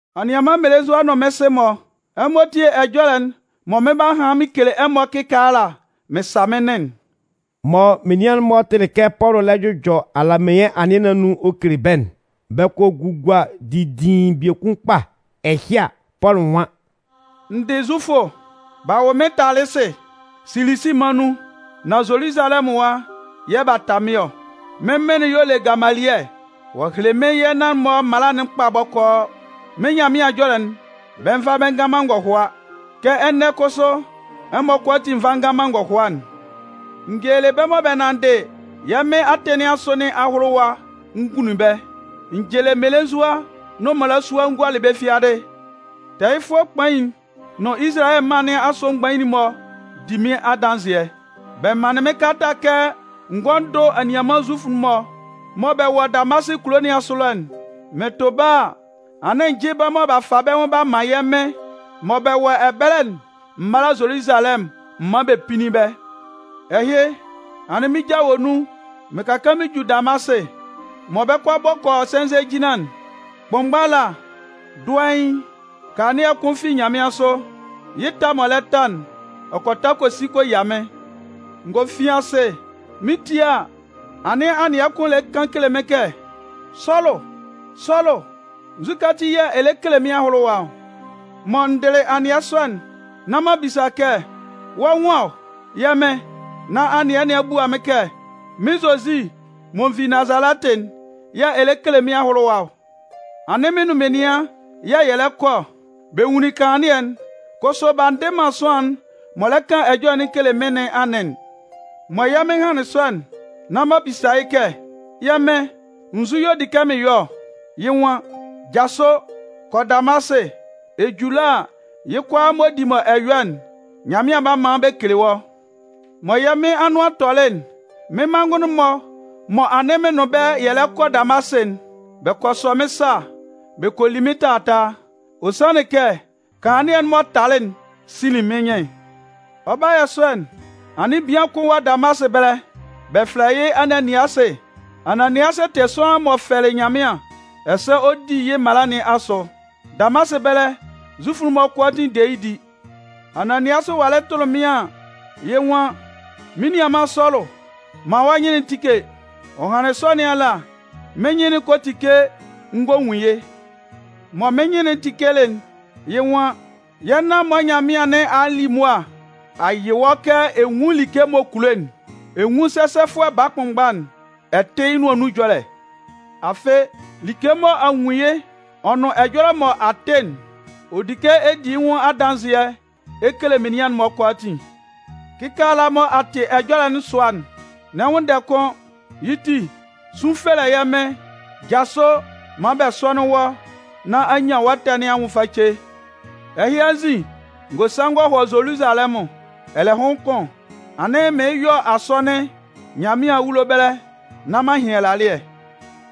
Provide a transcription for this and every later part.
“Anianman mmelenzua nʋn mɩ́n sɩ-mɔ, ɛmɔ tíe ɛjɔlɛ'n mɔ mɩn 'ba han mɩn kele ɛmɔ kɩkaala mɩn sa mɩ́n nɩn'n”. Mɔ menian'n-mɔ tɩlɩ kɛ Pɔlʋ lɛ jʋjɔ alameɩn anɩɛ nɩn anun ɔ kele bɛ́'n, bɛ kɔ gugua didiin biekun kpa. Ɛhɩ a, Pɔlʋ nwan: “N dɩ Zufʋ. B'a wʋ mɩ́n Talɩsɩ, Silisi mân nun, nan Zoluzalɛmʋn ɛwa yɛ̂ b'a ta mɩ́n ɔ. Mɩ́n mɩn'n y'ɔ le Gamalɩɛ. Ɔ a hele mɩ́n yɛ́ nan-mɔ mala'n kpa bɔkɔɔ. Mɩ́n Nyanmɩan ɛjɔlɛ'n, bɛ nva man bɛ ngan man ngɔhʋa kɛ ɛnɛ kʋsʋ ɛmɔ kʋalaatin nva ngan man ngɔhʋa'n. N gelelɩ bɛ́ mɔ bɛ nanndɩ yɛ́ Mɩn atɩn nɩn asʋ nɩn ahʋlʋwa n gunlun bɛ́. N cɩlɩ mmelenzua nʋn mmalasua n gualɩ bɛ́ fiadɩ. Tɛɛyɩfʋɛ kpain'n nʋn Izalayɛ mân nɩn asʋ mgbain'n-mɔ di mɩ́n adanzɩɛ. Bɛ manlɩn mɩ́n kalata kɛ n gɔ́ n dʋ́ anianman Zufʋ'n-mɔ mɔ bɛ wɔ Damasɩ kulo nɩn asʋ ɛlɔ'n. Mɩn tʋ bɛ́ a, anɩn n jɩ́ bɛ́ mɔ b'a fa bɛ́ nwʋn b'a man yɛ́ Mɩn mɔ bɛ wɔ ɛbɛlɛ'n m mála Zoluzalɛmʋn m mán bɛ pínnin bɛ́. “Ɛhɩ, anɩn mɩ́n ja wɔ nun mɩn ka kaan mɩn ju Damasɩ. Mɔ bɛ 'kɔ a bɔ kɔ yɔ sɛnzɛ jinlan'n, kʋnmgba ala, dʋɛɩn, kanlannɩɛ kʋn fi nyanmɩansʋ. Yɩ́ ta m'ɔ lɛ ta'n, ɔ kɔ ta kɔ si kɔ yia mɩ́n. N gɔ fin asɩ. Mɩn 'tie a, anɩn anɩɛ kʋn lɛ kan kele mɩ́n kɛ: ‘Sɔlʋ Sɔlʋ, nzukɛ ati yɛ̂ ɛ lɛ kele mɩ́n ahʋlʋwa ɔ?’ “Mɔ n dɩlɩ anɩɛ sɔ'n, nán m'an bisa kɛ: ‘Wɔ́ nwan ɔ, yɛ́ Mɩn?’ “Nán anɩɛ nɩn a bua mɩ́n kɛ: ‘Mɩ́n Zozi mɔ n vi Nazalɛtɩ'n yɛ̂ ɛ lɛ kele mɩ́n ahʋlʋwa ɔ.’ Anɩn mɩn nʋn menian yɛ̂ yɛ lɛ kɔ ɔ. Bɛ nwunlin kanlannɩɛ'n, kʋsʋ b'a ndɩ man sʋanlan'n m'ɔ lɛ kan ɛjɔlɛ'n kele mɩ́n nɩn anɩn'n. “Mɔ yɛ́ Mɩn hanlɩn sɔ'n, nán m'an bisa yɩ́ kɛ: ‘Yɛ̂ Mɩn, nzu y'ɔ di kɛ mɩn yɔ ɔ?’ “Yɩ́ nwan: ‘Jasʋ, kɔ Damasɩ. Ɛ ju ɛlɔ a, yɩ́ kʋalaa m'ɔ di mɔ ɛ yɔ'n, Nyanmɩan 'ba man bɛ kele wɔ́.’ “Mɔ yɛ́ Mɩn anʋan tɔlɩ'n, mɩ́n manngʋn'n-mɔ mɔ anɩn mɩn nʋn bɛ́ yɛ lɛ kɔ Damasɩ'n, bɛ kɔ sɔ mɩ́n sa bɛ kɔ li mɩ́n taataa. Ɔ sanlɩn kɛ, kanlannɩɛ'n m'ɔ talɩ'n sinlin mɩ́n nyɩn'n. “Ɔ 'ba yɔ sɔ'n, anɩn bian kʋn wɔ Damasɩ ɛbɛlɛ, bɛ fɛlɛ yɩ́ Ananiasɩ. Ananiasɩ tɩ sʋanlan m'ɔ fɛlɩ Nyanmɩan ɛsɛ ɔ di yɩ́ mala nɩn asʋ. Damasɩ ɛbɛlɛ Zufʋ'n-mɔ kʋalaatin de yɩ́ di. Ananiasɩ walɩ tʋlɩ mɩ́n an, yɩ́ nwan: ‘Mɩ́n nianman Sɔlʋ, man wɔ́ nyɩn'n tíke!’ Ɔ hanlɩn sɔ nɩn ala, mɩ́n nyɩn'n kɔ tike n gɔ nwun yɩ́. Mɔ mɩ́n nyɩn'n tikelɩ'n, yɩ́ nwan: ‘Yɛ́ nan-mɔ Nyanmɩan nɩn a li mʋa a yɩ wɔ́ kɛ ɛ nwún like m'ɔ kulo'n, ɛ nwún sɛsɛfʋɛ baa kʋnmgba'n, ɛ tɩ́ yɩ́ nʋan nun ɛjɔlɛ. Afɩ, like mɔ a nwun yɩ́ ɔ nʋn ɛjɔlɛ mɔ a tɩ'n, ɔ di kɛ ɛ di yɩ́ nwʋn adanzɩɛ ɛ kele menian'n-mɔ kʋalaatin. Kɩkaala mɔ a tɩ ɛjɔlɛ'n sʋa'n, n'ɛ nwʋnndɛ kʋ́n. Yɩ́ ti, sun fɛlɛ yɛ́ Mɩn, jasʋ maan bɛ sɔ́nɩn wɔ́ nán a nyan wɔ́ ɛtɛ nɩn anwʋn face.’ “Ɛhɩ anzin, n gɔ sa n gɔ hɔ Zoluzalɛmʋn. Ɛlɛhʋn kʋn, anɩn mɩɩn yɔ asɔnɩn Nyanmɩan awulo ɛbɛlɛ nán m'an hɩn ɛlalɩɛ.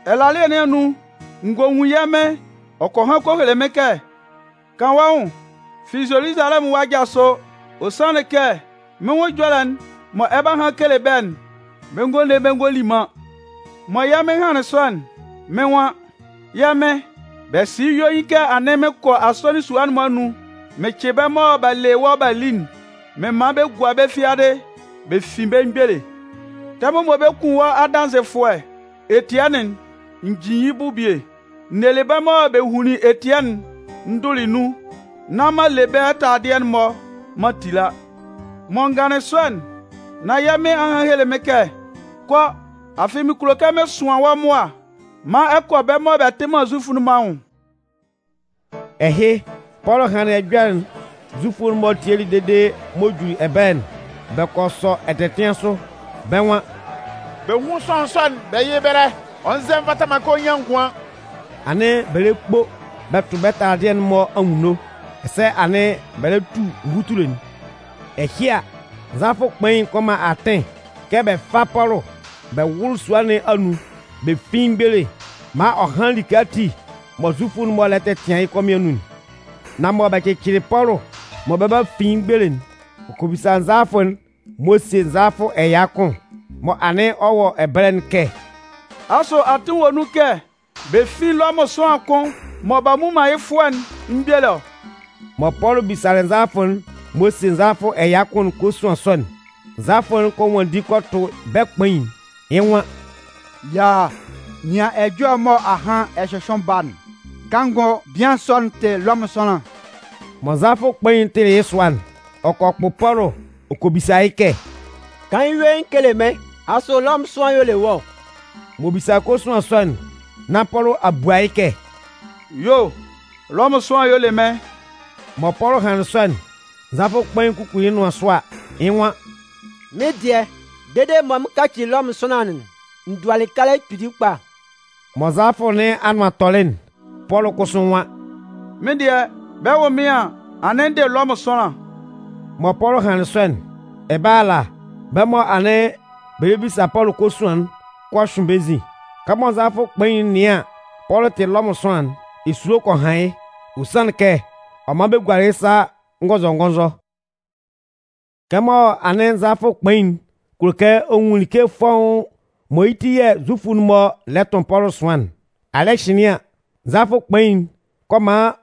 Ɛlalɩɛ nɩn anun, n gɔ nwun yɛ́ Mɩn, ɔ kɔ han kɔ hele mɩ́n kɛ: ‘Kan wɔ́ nwʋn fi Zoluzalɛmʋn ɛwa jasʋ, ɔ sanlɩn kɛ mɩ́n nwʋn ɛjɔlɛ'n mɔ ɛ 'ba han kele bɛ́'n, bɛ ngɔ le bɛ ngɔ li man.’ “Mɔ yɛ́ Mɩn hanlɩn sɔ'n, mɩ́n nwan: ‘Yɛ́ Mɩn, bɛ sɩ yɩ́ yuein kɛ anɩn mɩn kɔ asɔnɩn sua'n-mɔ anun mɩn cɩ bɛ́ mɔ b'a le wɔ́ b'a li'n mɩn man bɛ gua bɛ́ fiadɩ bɛ fin bɛ́ mgbele. Tɛmʋn mɔ bɛ 'kun wɔ́ adanzɩfʋɛ Etiɛnɩn'n, n jin yɩ́ bʋ bie. N nelɩ bɛ́ mɔ bɛ hunlin Etiɛnɩn'n n dʋlɩ nun nán m'an le bɛ́ taladɩɛ'n-mɔ m'an tila.’ “Mɔ n ganlɩn sɔ'n, nán yɛ́ Mɩn a han a hele mɩ́n kɛ: ‘Kɔ, afɩ mɩn kulo kɛ mɩn sʋan wɔ́ mʋa maan ɛ kɔ bɛ́ mɔ bɛ tɩ man Zufʋ'n-mɔ anwʋn.’” Ɛhɩ, Pɔlʋ hanlɩn ɛjɔlɛ'n Zufʋ'n-mɔ tielɩ dede m'ɔ juli ɛbɛlɛ'n, bɛ kɔ sɔ ɛtɛtɩan sʋ. Bɛ́ nwan: “Bɛ hún sʋanlan sɔ'n bɛ yɩ́ yɩ́ ɛbɛlɛ! Ɔ nzɛ nvata man kɛ ɔ nyan ngʋan!” Anɩn bɛ lɛ kpo bɛ tʋ bɛ́ taladɩɛ'n-mɔ anwunno ɛsɛ anɩn bɛ lɛ tu nvutule'n. Ɛhɩ a, nzalafʋ kpain'n kɔ man atɩn kɛ bɛ fá Pɔlʋ bɛ wʋ́lʋ sua nɩn anun bɛ fín yɩ́ mgbele maan ɔ hán like ati mɔ Zufʋ'n-mɔ lɛ tɛtɩan yɩ́ kɔmɩn anun'n. Nan mɔ bɛ cɩcɩlɩ Pɔlʋ mɔ bɛ 'ba fin yɩ́ mgbele'n, ɔ kɔ bisa nzalafʋ'n m'ɔ sie nzalafʋ ɛya kʋn mɔ anɩn ɔ wɔ ɛbɛlɛ'n kɛ: “Asʋ atɩn wɔ nun kɛ bɛ fín Lɔmʋn sʋanlan kʋn mɔ b'a mmu man yɩ́ fʋɔ'n mgbele ɔ?” Mɔ Pɔlʋ bisalɩ nzalafʋ'n m'ɔ sie nzalafʋ ɛya kʋn'n kosuan sɔ'n, nzalafʋ'n kɔ nwanndi kɔ tʋ bɛ́ kpain'n, yɩ́ nwan: “Yaaa, nɩan ɛjɔlɛ mɔ ahan ɛ hyʋhyʋɩn ba'n. Kanngʋ bian sɔ'n tɩ Lɔmʋn sʋanlan.” Mɔ nzalafʋ kpain'n tɩlɩ yɩ́ sʋa'n, ɔ kɔ kpʋ Pɔlʋ ɔ kɔ bisa yɩ́ kɛ: “Kan yɩ́ yuein kele mɩ́n, asʋ Lɔmʋn sʋanlan y'ɔ le wɔ́ ɔ?” M'ɔ bisalɩ kosuan sɔ'n nán Pɔlʋ a bua yɩ́ kɛ: “Yuo, Lɔmʋn sʋanlan y'ɔ le mɩ́n.” Mɔ Pɔlʋ hanlɩn sɔ'n, nzalafʋ kpain kukuli yɩ́ nʋan sʋ a, yɩ́ nwan: “Mɩ́n dɩɛ, dede mɔ mɩn 'kaci Lɔmʋn sʋanlan'n, n dualɩ kalɛ kpili kpa.” Mɔ nzalafʋ nɩn anʋan tɔlɩ'n, Pɔlʋ kʋsʋ nwan: “Mɩ́n dɩɛ, bɛ 'wʋ mɩ́n an, anɩn n dɩ Lɔmʋn sʋanlan.” Mɔ Pɔlʋ hanlɩn sɔ'n, ɛbɛlɛ ala, bɛ́ mɔ anɩn bɛ lɛ bisa Pɔlʋ kosuan'n kɔ hyʋɩn bɛ́ nzin. Kɛmɔ nzalafʋ kpain'n nɩan an, Pɔlʋ tɩ Lɔmʋn sʋanlan'n, esulo kɔ han yɩ́. Ɔ sanlɩn kɛ ɔ man bɛ gualɩ yɩ́ sa ngɔnzɔngɔnzɔ. Kɛmɔ anɩn nzalafʋ kpain'n kulo kɛ ɔ nwun like fɔ́ʋ́n mɔ yɩ́ ti yɛ̂ Zufʋ'n-mɔ lɛ tʋn Pɔlʋ ɛsʋan'n, alɩ́ɛ hɩnlɩn an, nzalafʋ kpain'n kɔ man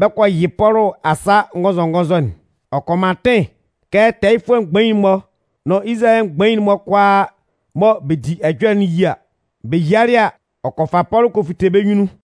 bɛ kɔ yɩ Pɔlʋ asa ngɔnzɔngɔnzɔ'n. Ɔ kɔ man atɩn kɛ tɛɛyɩfʋɛ mgbain'n-mɔ nʋn Izalayɛ mgbain'n-mɔ kʋalaa mɔ bɛ di ɛjɔlɛ'n yía. Bɛ yialɩ a, ɔ kɔ fa Pɔlʋ kɔ fite bɛ́ nyunnun.